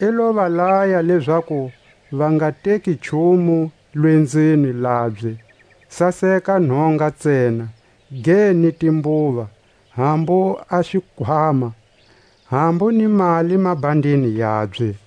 I lo va laya lezaku va nga teki nchumu lwenzweni labye, saseka nhonga ntsena; ge ni timbuva, hambu a xikhwama, hambu ni mali mabhandini yabye;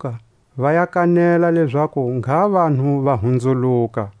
Va lo andlamuka, va ya kanela lezaku ngha vanhu va hunzuluka.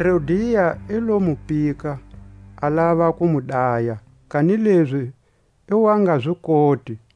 Herodia i lo mu pika, a lava ku mu daya, kanilezi i wa nga zi koti,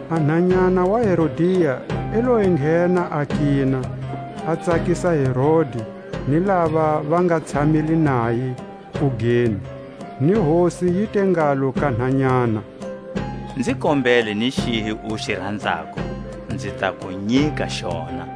a nhanyana wa Herodia i lo enghena a kina, a tsakisa Herodi ni lava va nga tshamile naye kugeni; ni hosi yi te ngalo ka nhanyana: Nzi kombele ni xihi u xi ranzako, nzi ta ku nyika xona.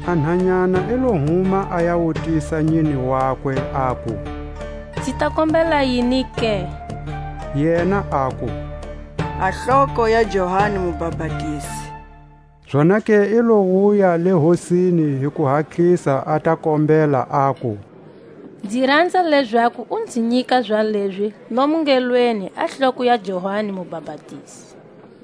A nhanyana i lo huma a ya wutisa nyine wakwe, aku: Nzi ta kombela yini ke? Yena aku: A hloko ya Johani Mubapatizi. Zonake i lo wuya le hosini hi kuhatlisa, a ta kombela aku: Nzi ranza lezaku u nzi nyika zalezi lomu ngelweni a hloko ya Johani Mubapatizi.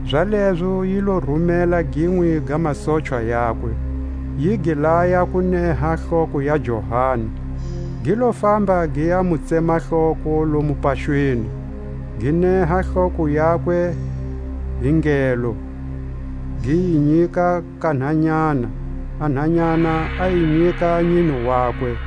Zalezo yi lo rumela ginwe ga masochwa yakwe, yi gi laya ku neha hloko ya Johani; gi lo famba gi ya mu tsema hloko lomo paxweni, gi neha hloko yakwe hi ngelo, gi yi nyika ka nhanyana; a nhanyana a yi nyika nyine wakwe.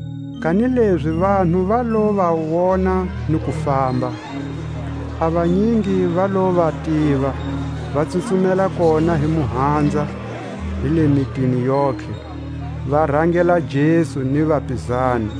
Kanilezi vanhu va lo va wona ni ku famba, a vanyingi va lo va tiva, va tsutsumela kona hi muhanza hi le mitini yontlhe, va rangela Jesu ni vapizani.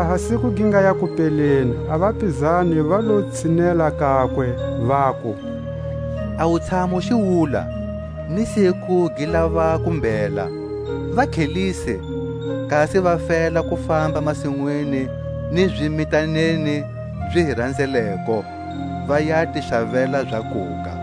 Laha siku gi ngaya kupeleni, a vapizani va lo tshinela kakwe, vaku: A wutshamu xiwula, ni siku gi lava ku mbhela; va tlhelise, kasi va fela ku famba masinwini ni zimitaneni zi hi ranzeleko, va ya ti xavela zakuga.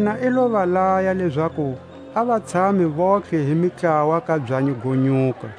Yena i lo va laya lezaku a va tshame vontlhe hi mitlawa ka byanyi go nyuka.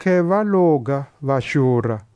Vontlhe va loga, va xura.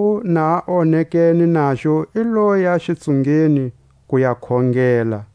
Anzhako na onekene naxo i loya xitsungeni ku ya khongela.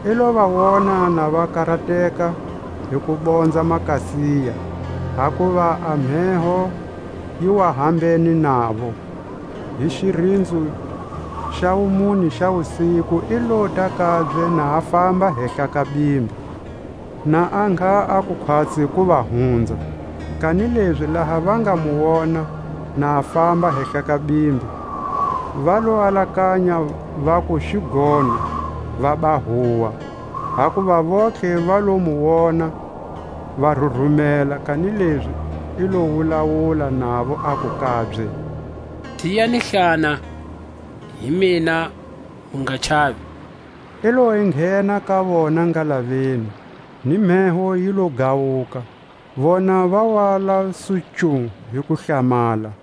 I lo va wona ha va karateka hi ku bonza makasiya, hakuva a mheho yi wa hambene navo; hi xirinzo xa wumune xa wusiku i lota kabye na famba hehla ka bimbi; na a ngha a ku khwatsi ku va hunza. Kanilezi laha va nga mu wona na a famba hehla ka bimbi, va lo alakanya vaku xigono, vaba huwa; hakuva vontlhe va lo mu wona, va rurumela. Kanilezi i lo wulawula navo, aku kabye: Tiyani hlana, hi mina; mu nga chavi. I lo enghena ka vona ngalaveni, ni mheho yi lo gawuka; vona va wa la su nchu hi kuhlamala,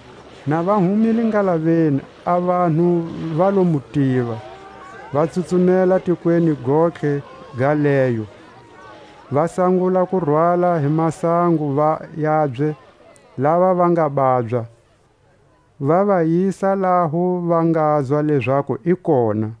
Na va humile ngalaveni a vanhu va lo mu tiva, va tsutsumela tikweni gontlhe ga leyo, va sangula ku rwala hi masango yabye lava va nga babya, va va yisa laho va ngazwa lezaku i kona.